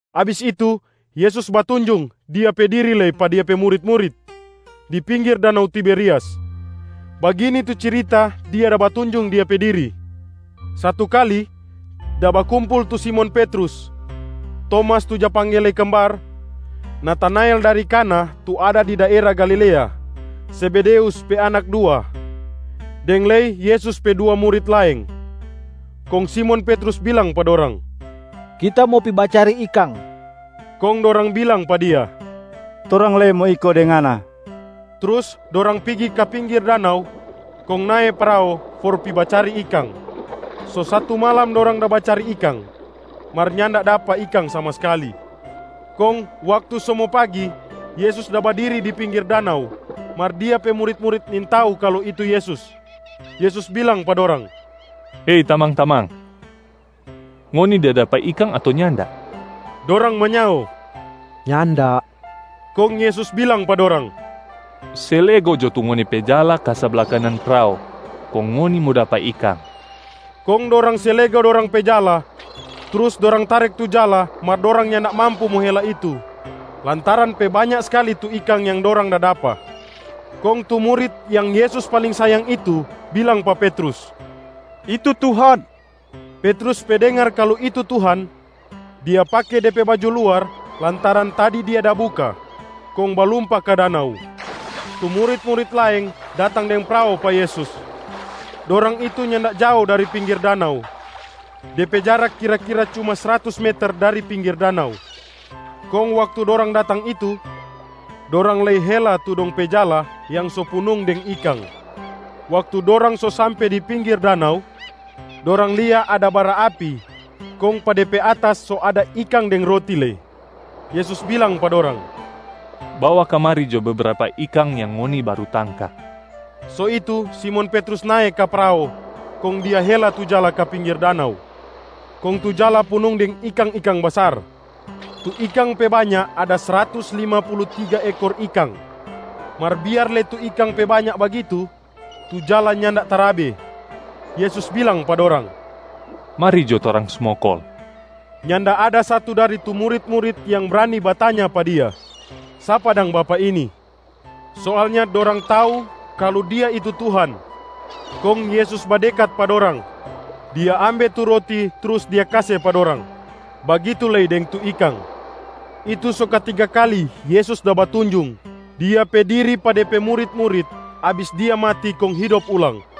Abis itu, Yesus batunjung Dia pe diri lei pa Dia pe murit-murit di pinggir danau Tiberias. Bagini tu cirita Dia da batunjung Dia pe diri: Satu kali, da bakumpul tu Simon Petrus, Tomas tu ja pangge lei Kembar, Natanael dari Kana tu ada di daera Galilea, Zebedeus pe anak dua, deng lei Yesus pe dua murit laeng. Kong Simon Petrus bilang pa dorang, “Kita mo pi bacari ikang.” Kong dorang bilang pa dia, “Torang lei mo iko deng ngana.” Trus dorang pigi ka pinggir danau kong nae prao for pi bacari ikang. So satu malam dorang da bacari ikang, mar nyanda dapa ikang sama skali. Kong waktu so mo pagi, Yesus da badiri di pinggir danau, mar Dia pe murit-murit nintau kalu itu Yesus. Yesus bilang pa dorang, “Hei tamang-tamang! Ngoni da dapa ikang ato nyanda?” Dorang manyao, “Nyanda.” Kong Yesus bilang pa dorang, “Se lego jo tu ngoni pe jala ka sabla kanan prao, kong ngoni mo dapa ikang.” Kong dorang se lego dorang pe jala trus dorang tarek tu jala mar dorang nyanda mampu mo hela itu lantaran pe banya skali tu ikang yang dorang da dapa. Kong tu murit yang Yesus paling sayang itu bilang pa Petrus, “Itu Tuhan!” Petrus pe dengar kalu itu Tuhan, dia pake de pe baju luar lantaran tadi dia da buka, kong balumpa ka danau. Tu murit-murit laeng datang deng prao pa Yesus. Dorang itu nyanda jao dari pinggir danau, de pe jarak kira-kira cuma sratus meter dari pinggir danau, kong waktu dorang datang itu dorang lei hela tu dong pe jala yang so punung deng ikang. Waktu dorang so sampe di pinggir danau, dorang lia ada bara api kong pa de pe atas so ada ikang deng roti lei. Yesus bilang pa dorang, “Bawa kamari jo bebrapa ikang yang ngoni baru tangka.” So itu Simon Petrus nae ka prao kong dia hela tu jala ka pinggir danau, kong tu jala punung deng ikang-ikang basar. Tu ikang pe banya ada sratus lima pulu tiga ekor ikang. Mar biar lei tu ikang pe banya bagitu, tu jala nyanda tarabe. Yesus bilang pa dorang, “Mari jo torang smokol.” Nyanda ada satu dari tu murit-murit yang brani batanya pa Dia, “Sapa dang Bapak ini?” Soalnya dorang tau kalu Dia itu Tuhan. Kong Yesus badekat pa dorang, Dia ambe tu roti trus Dia kase pa dorang, bagitu lei deng tu ikang. Itu so katiga kali Yesus da batunjung Dia pe diri pa De pe murit-murit abis Dia mati kong hidop ulang.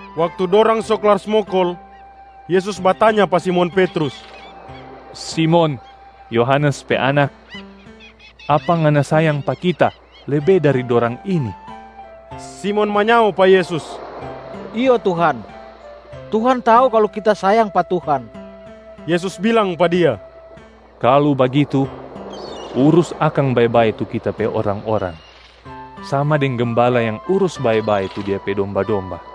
Waktu dorang so klar smokol, Yesus batanya pa Simon Petrus, “Simon, Yohanes pe anak, apa ngana sayang pa Kita lebe dari dorang ini?” Simon manyao pa Yesus, “Iyo Tuhan, Tuhan tau kalu kita sayang pa Tuhan.” Yesus bilang pa dia, “Kalu bagitu, urus akang bae-bae tu Kita pe orang-orang, sama deng gembala yang urus bae-bae tu dia pe domba-domba.”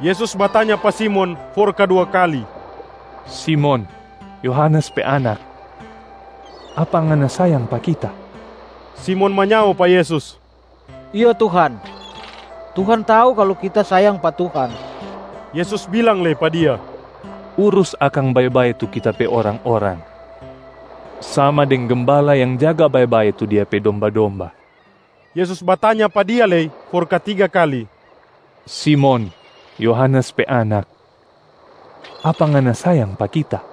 Yesus batanya pa Simon for kadua kali, “Simon, Yohanes pe anak, apa ngana sayang pa Kita?” Simon manyao pa Yesus, “Iyo Tuhan, Tuhan tau kalu kita sayang pa Tuhan.” Yesus bilang lei pa dia, “Urus akang bae-bae tu Kita pe orang-orang, sama deng gembala yang jaga bae-bae tu dia pe domba-domba.” Yesus batanya pa dia lei for katiga kali, “Simon, Yohanes pe anak, apa ngana sayang pa Kita?”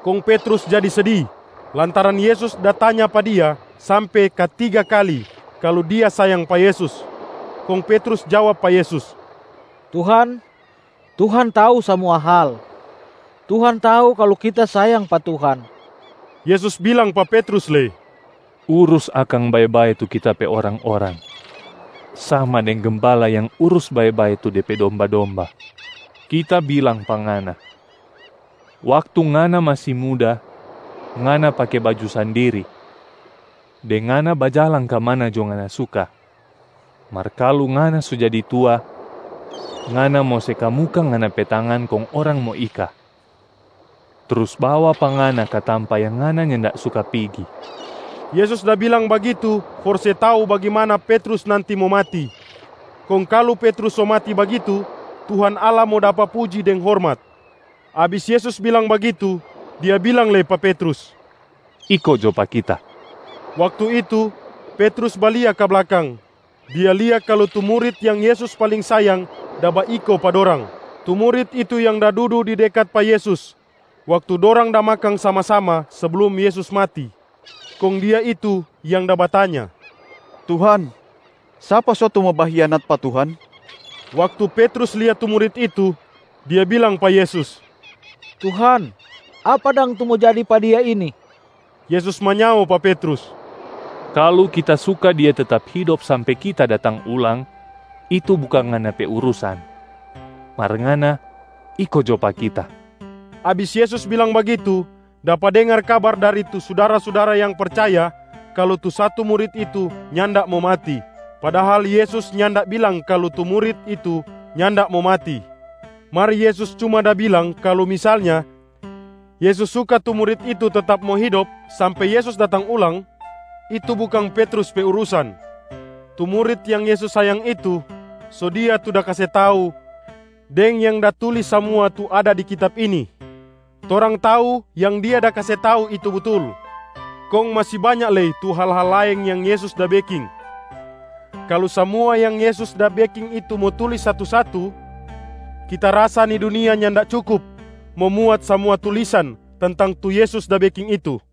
Kong Petrus jadi sedi lantaran Yesus da tanya pa dia sampe katiga kali kalu dia sayang pa Yesus. Kong Petrus jawab pa Yesus, “Tuhan, Tuhan tau samua hal, Tuhan tau kalu kita sayang pa Tuhan.” Yesus bilang pa Petrus lei, “Urus akang bae-bae tu Kita pe orang-orang, sama deng gembala yang urus bae-bae tu de pe domba-domba. Kita bilang pa ngana, waktu ngana masi muda, ngana pake baju sandiri deng ngana bajalang ka mana jo ngana suka. Mar kalu ngana so jadi tua, ngana mo se kamuka ngana pe tangan kong orang mo ika, trus bawa pa ngana ka tampa yang ngana nyanda suka pigi.” Yesus da bilang bagitu for se tau bagimana Petrus nanti mo mati, kong kalu Petrus so mati bagitu, Tuhan Allah mo dapa puji deng hormat. Abis Yesus bilang bagitu, Dia bilang lei pa Petrus, “Iko jo pa Kita.” Waktu itu, Petrus balia ka blakang, dia lia kalu tu murit yang Yesus paling sayang da baiko pa dorang. Tu murit itu yang da dudu di dekat pa Yesus waktu dorang da makang sama-sama seblum Yesus mati. Kong dia itu yang da batanya, “Tuhan, sapa so tu mo bahianat pa Tuhan?” Waktu Petrus lia tu murit itu, dia bilang pa Yesus, “Tuhan, apa dang tu mo jadi pa dia ini?” Yesus manyao pa Petrus, “Kalu Kita suka dia tetap hidop sampe Kita datang ulang, itu bukang ngana pe urusan. Mar ngana, iko jo pa Kita.” Abis Yesus bilang bagitu, dapa dengar kabar dari tu sudara-sudara yang percaya kalu tu satu murit itu nyanda mo mati. Padahal Yesus nyanda bilang kalu tu murit itu nyanda mo mati, mar Yesus cuma da bilang kalu misalnya Yesus suka tu murit itu tetap mo hidop sampe Yesus datang ulang, itu bukang Petrus pe urusan. Tu murit yang Yesus sayang itu, so dia tu da kase tau deng yang da tulis samua tu ada di kitab ini. Torang tau yang dia da kase tau itu butul. Kong masi banya lei tu hal-hal laeng yang Yesus da beking. Kalu samua yang Yesus da beking itu mo tulis satu-satu, kita rasa ni dunia nyanda cukup mo muat samua tulisan tentang tu Yesus da beking itu.